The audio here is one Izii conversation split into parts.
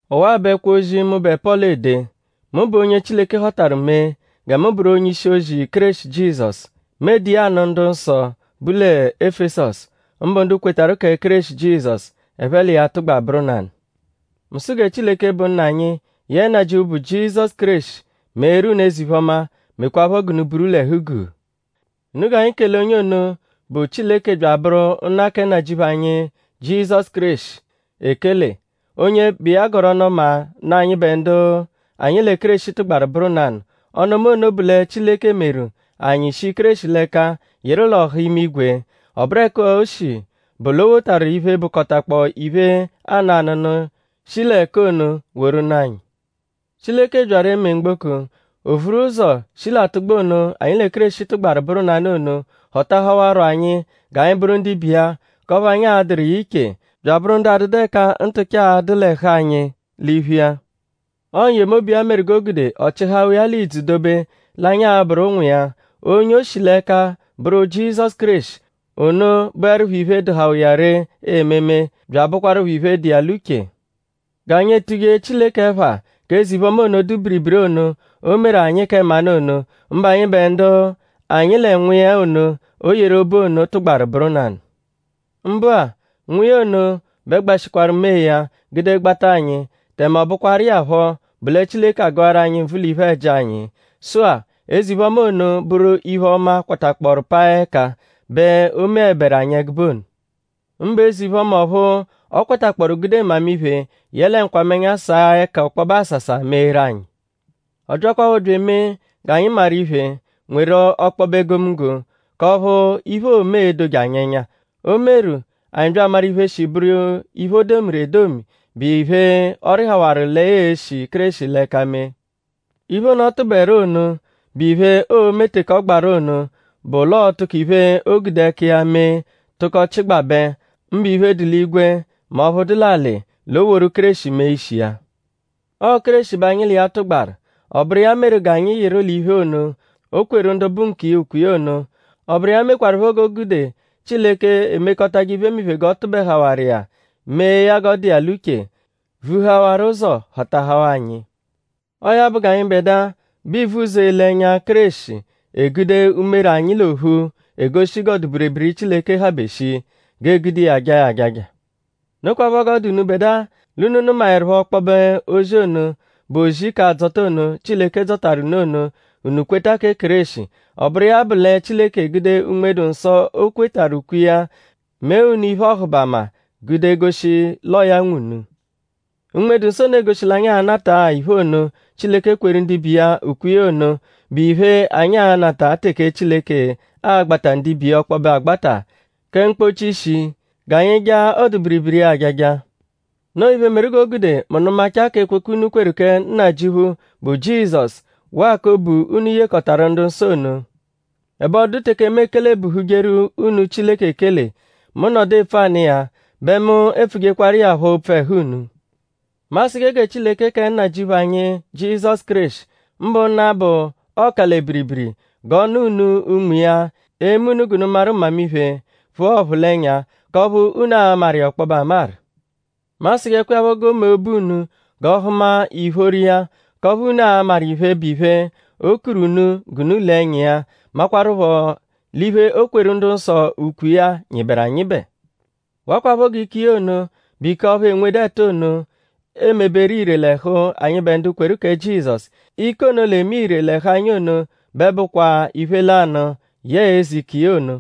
Ọwa-a bụ ẹkwo-ozi, mụbe Pọlu ede. Mu bụ onye Chileke họtaru mee gẹ mu bụru onye-ishi-ozi Kéreshi Jizọsu. Mu ede iya anụ ndu dụ-nsọ, bu lẹ Efesọsu; mbụ ndu kwetarụ kẹ Kéreshi Jizọsu; ẹphe l'iya tụgba bụru nanụ. Mu sụ gẹ Chileke, bụ Nna anyi yẹe Nnajịuphu, bụ Jizọsu Kéreshi meeru unu eze-iphe-ọma; mekwaaphọ g'unu buru l'ẹhu-guu. Unu g'anyi kele onye ono, bụ Chileke bya abụru Nna kẹ Nnajịuphu anyi Jizọsu Kéreshi ekele; onye bụ iya gọru ọnu-ọma nụ anyịbe ndu anyi lẹ Kéreshi tụgbaru bụru nanụ. Ọnu-ọma ono bụ lẹ Chileke meru; anyi shi Kéreshi l'ẹka yịru l'ọha imigwe. Ọ bụru ẹka o shi bụ l'o wotaru iphe, bụkotakpoo iphe, aanụ anụnu, shi l'ẹka ono woru nụ anyi. Chileke byaru eme mgboko; o vuru ụzo shi l'atụgba ono, anyi lẹ Kéreshi tụgbaru bụru nanụ ono; họtahawaro anyi g'anyi bụru ndibe iya; k'ọphu anyi a-dụru iya iche; bya abụru ndu adụdu ẹka ntụcha a-dụ l'ẹhu anyi l'iphu iya. Ọo n-yemobu iya meru g'o gude ọ chịhawa iya l'ìdzù dobe l'anyi a-bụru ụnwu iya; onye oo-shi l'ẹka bụru Jizọsu Kéreshi. Ono bụerupho iphe, dụhawa iya ree ememe bya abụkwarupho iphe dụ iya l'uche; g'anyi etuje Chileke ẹpha k'eze-iphe-ọma ono, dụ biribiri ono, o meru anyi kẹ mmanụ ono; mbụ anyịbe ndu anyi lẹ Nwa iya ono, o yeru obu ono tụgbaru bụru nanụ. Mbụ-a; Nwa iya ono bẹ gbashịkwaru mee ya; gude gbata anyi; tẹme ọ bụkwaru iya phọ bụ lẹ Chileke agụaru anyi nvụ l'iphe-ẹji anyi. Sụ-a; eze-iphe-ọma ono bụru iphe-ọma, kwatakpọoru paa ẹka bẹ o meẹberu anyi ẹgube ono; mbụ eze-iphe-ọma ọphu ọ kwatakpọoru gude mmamiphe yẹle nkwamẹnya saa ẹka ọkpobe asasa meeru anyi. Ọ byakwaphọ bya emee g'anyi maru iphe; nweru ọkpobe egomunggo; k'ọphu iphe, oome e-doje anyi ẹnya. O meru; anyi bya amaru iphe, shi bụru iphe, o domiru edomi, bụ iphe, ọ rịhawaru lẹ ya e-shi Kéreshi l'ẹka mee. Iphe ono, ọ tụberu ono, bụ iphe, oo-me teke ọ gbaru ono bụ l'ọo-tụko iphe, o gude ẹka iya mee tụko chịgbabe; mbụ iphe, dụ l'igwe; mẹ ọphu dụ l'alị; l'o woru Kéreshi mee ishi iya. Ọo Kéreshi bẹ anyi l'iya tụgbaru; ọ bụru iya meru g'anyi yịru l'iphe ono, o kweru ndu bụ nkiya ukwe iya ono. Ọ bụru iya mekwarụpho g'o gude Chileke, emekọtaje iphemiphe g'ọ tụbehawaru iya; mee ya g'ọ dụ iya l'uche; vuhawaru ụzo họtahawaa anyi. Ọo ya bụ g'anyịbedua, bụ ivuzọ ele ẹnya Kéreshi egude umere anyi l'ophu egoshi g'ọdu-biribiri Chileke habe shii; g'ee-gude iya jaa ya ajaja. Nokwaphọ g'ọ dụ unubẹdua; l'unu nụmaerupho ọkpobe ozi ono, bụ ozi k'adzọta ono, Chileke dzọtaru unu ono; unu kweta kẹ Kéreshi. Ọ bụru iya bụ lẹ Chileke egude Unme-dụ-Nsọ, o kwetarụ ukwe iya; mee unu iphe-ọhubama; gude goshi l'ọo ya nwe unu. Unme-dụ-Nsọ ono egoshi l'anyi a-nata-a iphe ono, Chileke kweru ndibe iya ukwe iya ono, bụ iphe, anyi a-nata teke Chileke a-gbata ndibe iya ọkpobe agbata kẹ mkpọchi-ishi; g'anyi jaa ọdu-biribiri iya ajaja. Noo iphe, meru g'o gude mu nụmachaa k'ekwekwe unu kweru kẹ nnajịuphu, bụ Jizọsu waa k'obu unu yekọtaru ndu-nsọ ono; ẹbe ọ dụdu teke mu ekelebuhujeru unu Chileke ekele. Mu -nọdu epfu anụ iya; bẹ mu epfujekwaru iya phọ opfu ẹhu unu. Mu asụje gẹ Chileke kẹ Nnajịuphu anyi Jizọsu Kéreshi; mbụ Nna bụ Ọ-ka-lẹ-biribiri; g'ọ nụ unu Unme iya, e-me unu g'unu maru mmamiphe; phụa ọphulenya; k'ọphu unu a-maru iya ọkpobe amaru. Mu asụjekwa iya phọ g'o mee obu unu g'ọ hụma ìphóró iya; k'ọphu unu a-maru iphe, bụ iphe, o kuru unu g'unu le ẹnya iya; makwaruphọ l'iphe, o kweru ndu-nsọ ukwe iya nyịberu anyịbe. Wakwaphọ g'ike iya ono, bụ ike ọphu enwedu ẹtu ono emeberu ire l'ẹhu anyịbe ndu kweru kẹ Jizọsu. Ike ono, l'eme ire l'ẹhu anyi ono bẹ bụkwaa iphe lanụ yẹe eze ike iya ono,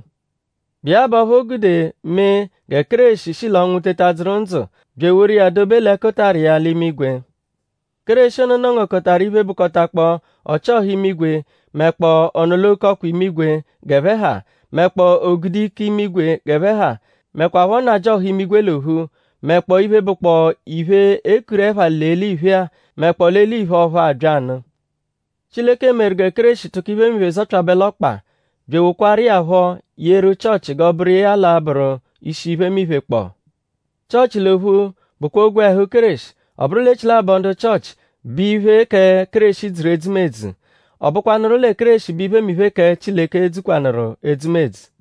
bụ iya bụ ọphu o gude mee gẹ Kéreshi shi l'ọnwu teta dzụru ndzụ; bya eworu iya dobe l'ẹkutara iya l'imigwe. Kéreshi ono nọ-ngokọtaru iphe, bụkotakpoo ọchi-ọha imigwe; mẹkpoo ọ-nọ-l'oke-ọkwa imigwe g'ẹphe ha; mẹkpoo o-gude-ike imigwe g'ẹphe ha; mẹkwapho nnajịoha imigwe l'ophu; mẹkpoo iphe, bụkpoo iphe, e kuru ẹpha l'eliphe-a; mẹkpoo l'eliphe ọphu abya nụ. Chileke meru gẹ Kéreshi tụko iphemiphe zọpyabe l'ọkpa; bya ewokwaru iya phọ yeru Chịochi g'ọ bụru iya l'a-bụru ishi iphemiphe kpọo. Chịochi l'ophu bụkwa ogwẹhu Kéreshi; ọ bụru l'echilabọ ndu Chịochi bẹ iphe kẹ Kéreshi dzuru edzumedzu. Ọ bụkwanuru lẹ Kéreshi bẹ iphemiphe kẹ Chileke dzukwanụru edzumedzu.